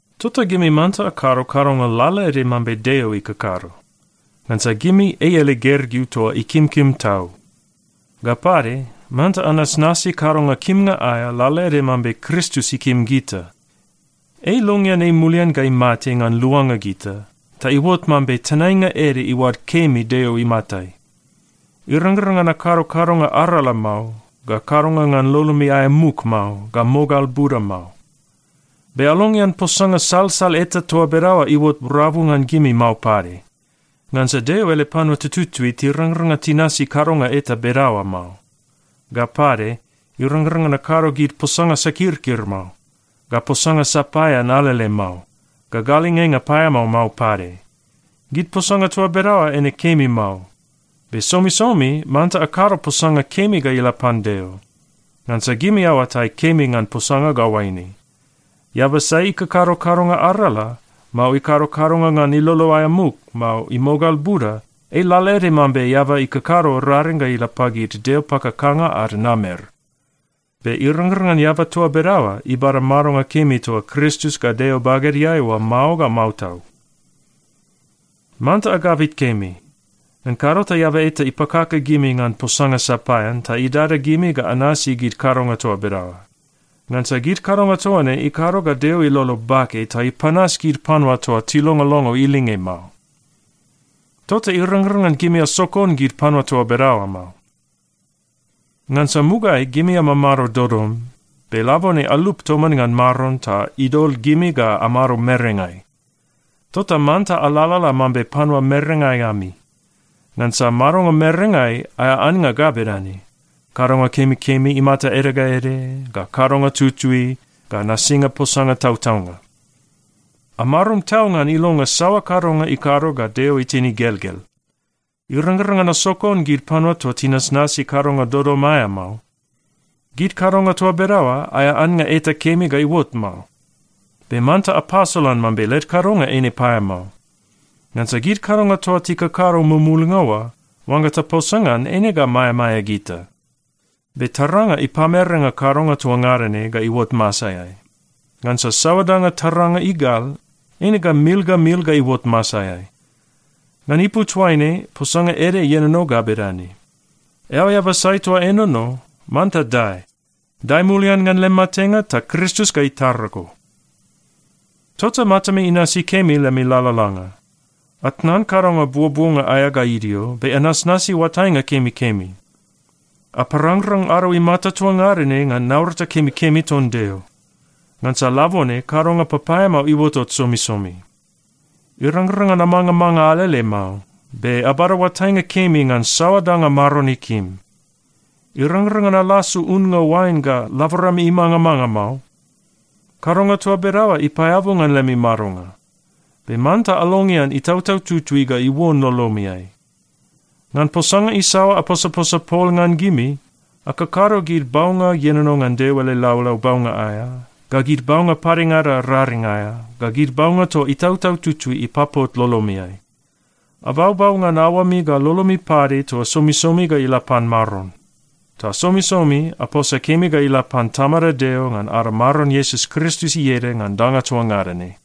Tota gimi manta akado kadonga lalaede mambe Deo ikakado. Ngansa gimi ei ele gergeu toa ikimkim tau. Ga pade, manta anasnasi kadonga kimnga aea lalaede mambe Kristus ikim gita. Ei ilongean ei mulian ga imate ngan luanga gita, ta iuot mambe tenainga ede iuad kemi Deo imatai. Irangrang ngan akado kadonga arala mao, ga kadonga ngan lolomi aea muk mao, ga mogal buda mao. Be alongean posanga salsal eta toa bedaoa iuot rabu ngan gimi mao pade, ngansa Deo ele panua tututui tirangrang ngan tinasi kadonga eta bedaoa mao. Ga pade, irangrang ngan akado gid posanga sakirkir mao, ga posanga sapaean alele mao, ga galingenga paeamao mao pade. Gid posanga toa bedaoa eine kemi mao. Be somisomi manta akado posanga kemi ga ila pan Deo. Ngansa gimi aoatai kemi ngan posanga ga oaine: Eaba sai ikakado kadonga arala, mao ikado kadonga ngan ilolo aea muk, mao imogal buda, ei lalaede mambe eaba ikakado raring ga ila pagid deo pakakanga ad namer. Be irangrang ngan eaba toa bedaoa ibada madonga kemi toa Kristus ga Deo bagedeai oa mao ga mao tau. Manta agabit kemi. Ngan kado ta eaba eta ipakaka gimi ngan posanga sapaean ta idada gimi ga anasi gid kadonga toa bedaoa. Ngansa gid kadonga toa ne ikado ga Deo ilolo bake ta ipanas gid panua toa tilongolongo ilinge mao. Tota irangrang ngan gimi asokon gid panua toa bedaoa mao. Ngansa mugaeai gimi amamado dodom. Be labone alup toman ngan Maron ta idol gimi ga amado merengai. Tota manta alalala mambe panua merengai ami. Ngansa madonga merengai, aea annga ga bedane: kadonga kemikemi imata ede ga ede, ga kadonga tutui, ga nasinga posanga tautaunga. Amarum tau ngan ilonga saoa kadonga ikado ga Deo itin igelgel. Irangrang ngan asokon gid panua toa tinasnasi kadonga dodom aea mao. Gid kadonga toa bedaoa, aea annga eta kemi ga iuot mao. Be manta apasolan mambe led kadonga eine paeamao. Ngansa gid kadonga toa tikakado mumulnga oa, oangga taposa ngan, eine ga maeamaea gita. Be taranga ipamerenga kadonga toa ngada ne ga iuot masaeai. Ngansa saoa danga taranga igal, eine ga mil ga mil ga iuot masaeai. Ngan ipu toaine posanga ede ienono ga bedane, “Eao eaba sai toa enono, manta dae! Dae mulian ngan lem matenga, ta Kristus ga itara go.” Tota matami inasi kemi lemi lalalanga. Atnan kadonga buobuonga aea ga idio, be anasnasi oatainga kemikemi. Aparangrang ado imata toa ngada ne ngan naurata kemikemi ton Deo. Ngansa labone kadonga papaeamao iuotot somisomi. Irangrang ngan amangamanga alele mao. Be abada oatainga kemi ngan saoa danga Maron ikim. Irangrang ngan alasu unnga oain ga laborami imangamanga mao. Kadonga toa bedaoa ipaeabu ngan lemi madonga. Be manta alongean Itautau Tutui ga iuon lolomiai. Ngan posanga isaoa aposaposa pol ngan gimi, akakado gid baunga ienono ngan Deo ele laulau baunga aea, ga gid baunga padengada raring aea, ga gid baunga toa Itautau Tutui ipapot lolomiai. Abaubau ngan aoami ga lolomi pade toa somisomi ga ila pan Maron. Ta somisomi, aposa kemi ga ila pan Tamada Deo ngan ada Maron Iesus Kristus ieda ngan danga toa ngada ne.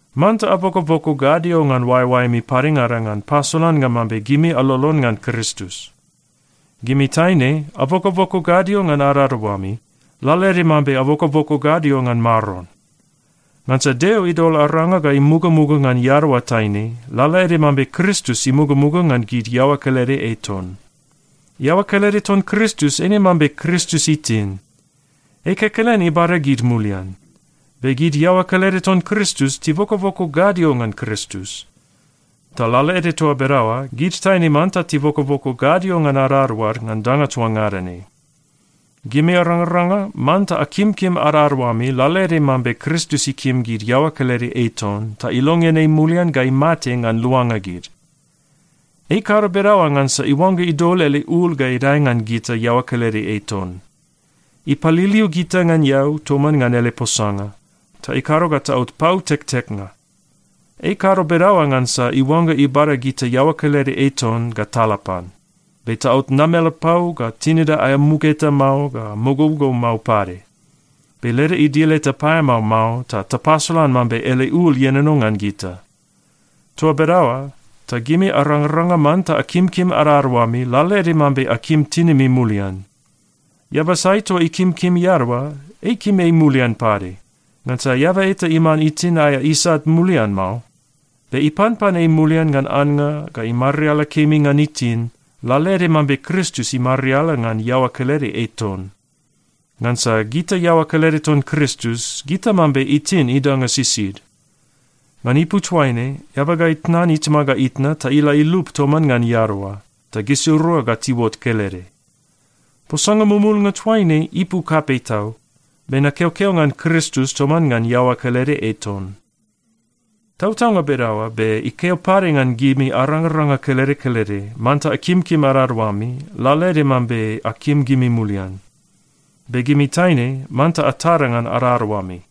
Manta abokoboko gadio ngan oaeoaemi padengada ngan pasolannga mambe gimi alolon ngan Kristus. Gimi taine, abokoboko gadio ngan adadaoami, lalaede mambe abokoboko gadio ngan Maron. Ngansa Deo idol aranga ga imugamuga ngan iadaoa taine, lalaede mambe Kristus imugamuga ngan gid iaoa kelede ei ton. Iaoa kelede ton Kristus eine mambe Kristus itin. Ei kekelen ibada gid mulian. Be gid iaoa kelede ton Kristus tibokoboko gadio ngan Kristus. Ta lalaede toa bedaoa, gid taine manta tibokoboko gadio ngan adadaoad ngan danga toa ngada ne. Gimi arangaranga, manta akimkim adadaoami lalaede mambe Kristus ikim gid iaoa kelede ei ton ta ilongean ei mulian ga imate ngan luanga gid. Ei ikado bedaoa ngansa iuangga idol ele ul ga idae ngan gita iaoa kelede ei ton. Ipaliliu gita ngan eau toman ngan ele posanga, ta ikado ga taot pau tekteknga. Ei ikado bedaoa ngansa iuangga ibada gita iaoa kelede ei ton ga tala pan, be taot namelapau ga tinida aea muk eta mao ga mogougou mao pade. Be leda idil eta paeamao mao ta tapasolan mambe ele ul ienono ngan gita. Toa bedaoa ta gimi arangaranga manta akimkim adadaoami lalaede mambe akim tinimi mulian. Eaba sai toa ikimkim iadaoa, ei ikim ei mulian pade. Ngansa eaba eta iman itin aea isat mulian mao. Be ipanpan ei mulian ngan annga ga imariala kemi ngan itin, lalaede mambe Kristus imariala ngan iaoa kelede ei ton. Ngansa gita iaoa kelede ton Kristus, gita mambe itin idanga sisid. “Ngan ipu toaine, eaba ga itnan itama ga itna ta ila ilup toman ngan iadaoa, ta gisirua ga tiuot kelede.” Posanga mumulnga toaine ipu kapei tau. Be nakeokeo ngan Kristus toman ngan iaoa kelede ei ton. Tautaunga bedaoa, be ikeo pade ngan gimi arangaranga kelede kelede, manta akimkim adadaoami lalaede mambe akim gimi mulian. Be gimi taine manta atada ngan adadaoami.